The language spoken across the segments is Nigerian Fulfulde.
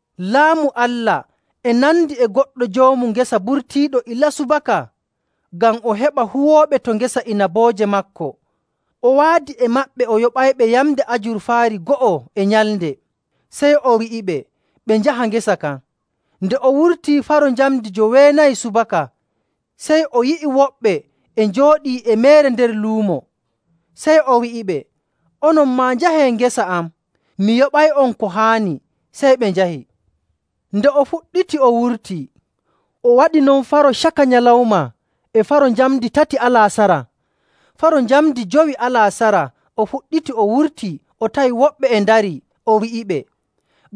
“Laamu Allah e nandi e goɗɗo joomu ngesa burtiiɗo ilaa subaka ngam o heɓa huwooɓe to ngesa inabooje maako. O waadi e maɓɓe o yoɓayɓe yamnde ajurfaari go'o e nyalnde, sey o wi'iɓe ɓe njaha ngesa kan. Nde o wurtii faro njamndi joweenayi subaka, sey o yi'i woɓɓe e njooɗii e meere nder luumo. Sey o wi'iɓe, ‘Onon maa njahee ngesa am, mi yoɓay'on ko haani.’ Sey ɓe njahi. Nde o fuɗɗiti o wurtii, o waɗi non faro caka nyalawma e faro njamndi tati alaasara. Faro njamndi jowi alaasara o fuɗɗiti o wurtii o tawi woɓɓe e ndarii, o wi'iɓe,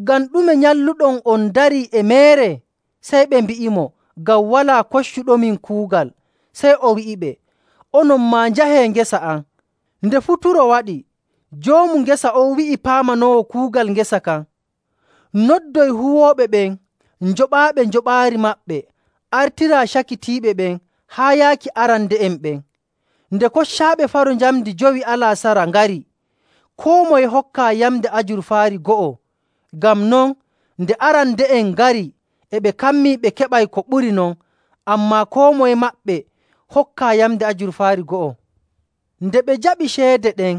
‘Ngam ɗume nyalluɗon on ndarii e meere?’ Sey ɓe mbi'imo, ‘Ngam walaa koccuɗomin kuugal.’ Sey o wi'iɓe, ‘Onon maa njahee ngesa am.’ “Nde futuro waɗi, joomu ngesa on wi'i paamanoowo kuugal ngesa kan, ‘Noddoy huwooɓe ɓen, njoɓaaɓe njoɓaari maɓɓe, artiraa cakitiiɓe ɓen haa yaaki arande'en ɓen.’. Nde koccaaɓe faro njamndi jowi alaasara ngari, koo moye hokkaa yamnde ajurfaari go'o. Ngam non, nde arande'en ngari, e ɓe kammii ɓe keɓay ko ɓuri non, ammaa koo moye maɓɓe hokkaa yamnde ajurfaari go'o. Nde ɓe njaɓi ceede ɗen,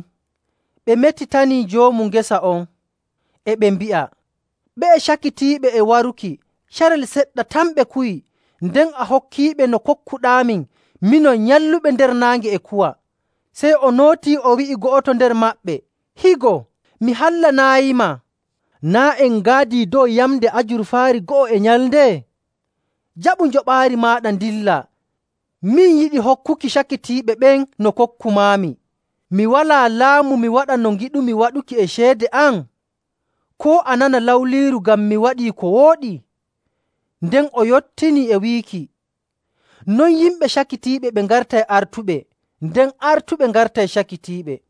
ɓe metitani joomu ngesa on, e ɓe mbi'a, ‘Ɓe'e cakitiiɓe e waruki, carel seɗɗa tan ɓe kuwi, nden a hokkiiɓe no kokkuɗaamin, minon nyalluɓe nder naange e kuwa.’ Sey o nootii, o wi'i go'oto nder maɓɓe, ‘Higo, mi hallanaayima. Naa' en ngaadii dow yamnde ajurfaari go'o e nyalnde? Jaɓu njoɓaari maaɗa, ndillaa. Min yiɗi hokkuki cakitiiɓe ɓen no kokkumaami. Mi walaa laamu mi waɗa no ngiɗumi waɗuki e ceede am? Koo a nana lawliiru ngam mi waɗi ko wooɗi?’” Nden o yottini e wiiki, “Non yimɓe cakitiiɓe ɓe ngartay artuɓe, nden artuɓe ngartay cakitiiɓe.”.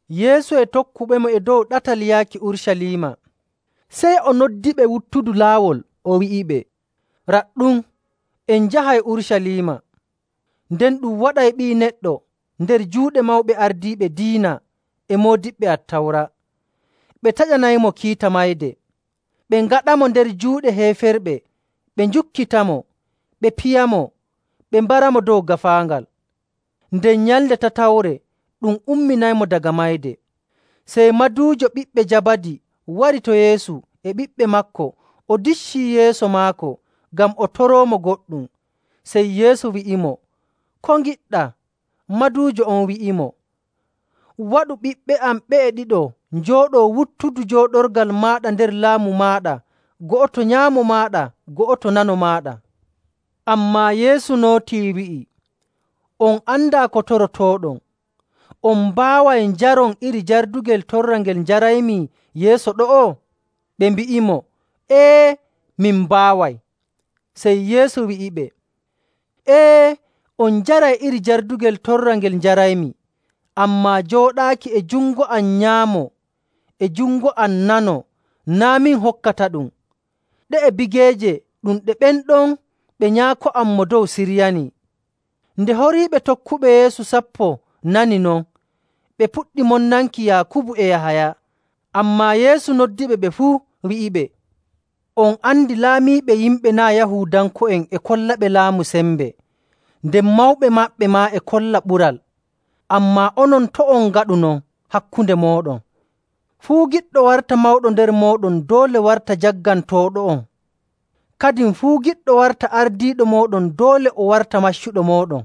Yeesu e tokkuɓemo e dow ɗatal yaaki Urucaliima, sey o noddiɓe wuttudu laawol, o wi'iɓe, “Raɗɗum, en njahay Urucaliima, nden ɗum waɗay Ɓii Neɗɗo nder juuɗe mawɓe ardiiɓe diina e moodiɓɓe Attawra. Ɓe taƴanaymo kiita mayde, ɓe ngaɗamo nder juuɗe heeferɓe ɓe njukkitamo, ɓe piyamo, ɓe mbaramo dow gaafaangal. Nden nyalnde tatawre ɗum umminaymo daga mayde.” Sey maduujo ɓiɓɓe Jabadi wari to Yeesu e ɓiɓɓe maako o diccii yeeso maako, ngam o toroomo goɗɗum. Sey Yeesu wi'imo, “Ko ngiɗɗaa?” Maduujo on wi'imo, “Waɗu ɓiɓɓe am ɓe'e ɗiɗo njooɗoo wuttudu jooɗorgal maaɗa nder Laamu maaɗa, go'oto nyaamo maaɗa go'oto nano maaɗa.” Ammaa Yeesu nootii, wi'i, “On andaa ko torotooɗon. On mbaaway njaron iri jardugel torra ngel njaraymi yeeso ɗo'o?” Ɓe mbi'imo, “Ee, min mbaaway.” Sey Yeesu wi'iɓe, “Ee, on njaray iri jardugel torra ngel njaraymi, ammaa jooɗaaki e jungo am nyaamo e jungo am nano naa' min hokkataɗum. Ɗe'e bigeeje ɗum ɗe ɓen ɗon ɓe Nyaako am Mo Dow siryanii.” Nde horiiɓe tokkuɓe Yeesu sappo nani non, ɓe puɗɗi monnanki Yaakubu e Yahaya. Ammaa Yeesu noddiɓe ɓe fuu, wi'iɓe, “On andi laamiiɓe yimɓe naa' Yahuudanko'en e kollaɓe laamu sembe, nden mawɓe maɓɓe maa e kolla ɓural. Ammaa onon, to' on ngaɗu non hakkunde mooɗon. Fuu giɗɗo warta mawɗo nder mooɗon doole warta jaggantooɗo'on.. Kadin fuu giɗɗo warta ardiiɗo mooɗon, doole o warta maccuɗo mooɗon..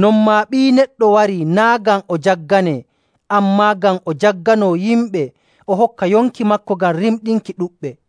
Non maa Ɓii Neɗɗo warii naa' ngam o jagganee, ammaa ngam o jagganoo yimɓe, o hokka yonki maako ngam rimɗinki ɗuɗɓe.”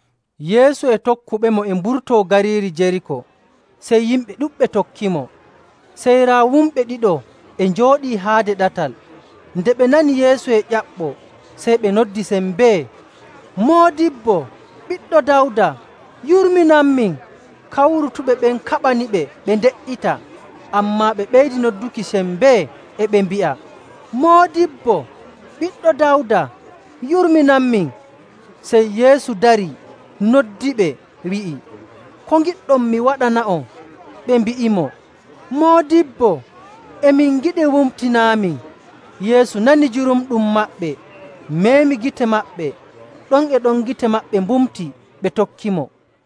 Yeesu e tokkuɓemo e mburtoo gariiri Jeriiko, sey yimɓe ɗuɗɓe tokkimo. Sey raa wumɓe ɗiɗo e njooɗii haade ɗatal. Nde ɓe nani Yeesu e ƴaɓɓoo, sey ɓe noddi sembee, “Moodibbo, Ɓiɗɗo Dawda, yurminanmin!” Kawrutuɓe ɓen kaɓaniɓe ɓe nde''ita, ammaa ɓe ɓeydi nodduki e sembe, e ɓe mbi'a, “Moodibbo, Ɓiɗɗo Dawda, yurminanmin!” Sey Yeesu darii, noddiɓe, wi'i, “Ko ngiɗɗon mi waɗana'on?” Ɓe mbi'imo, “Moodibbo, e min ngiɗi mbumtinaamin.” Yeesu nani jurumɗum maɓɓe, meemi gite maɓɓe. Ɗon e ɗon gite maɓɓe mbumti, ɓe tokkimo.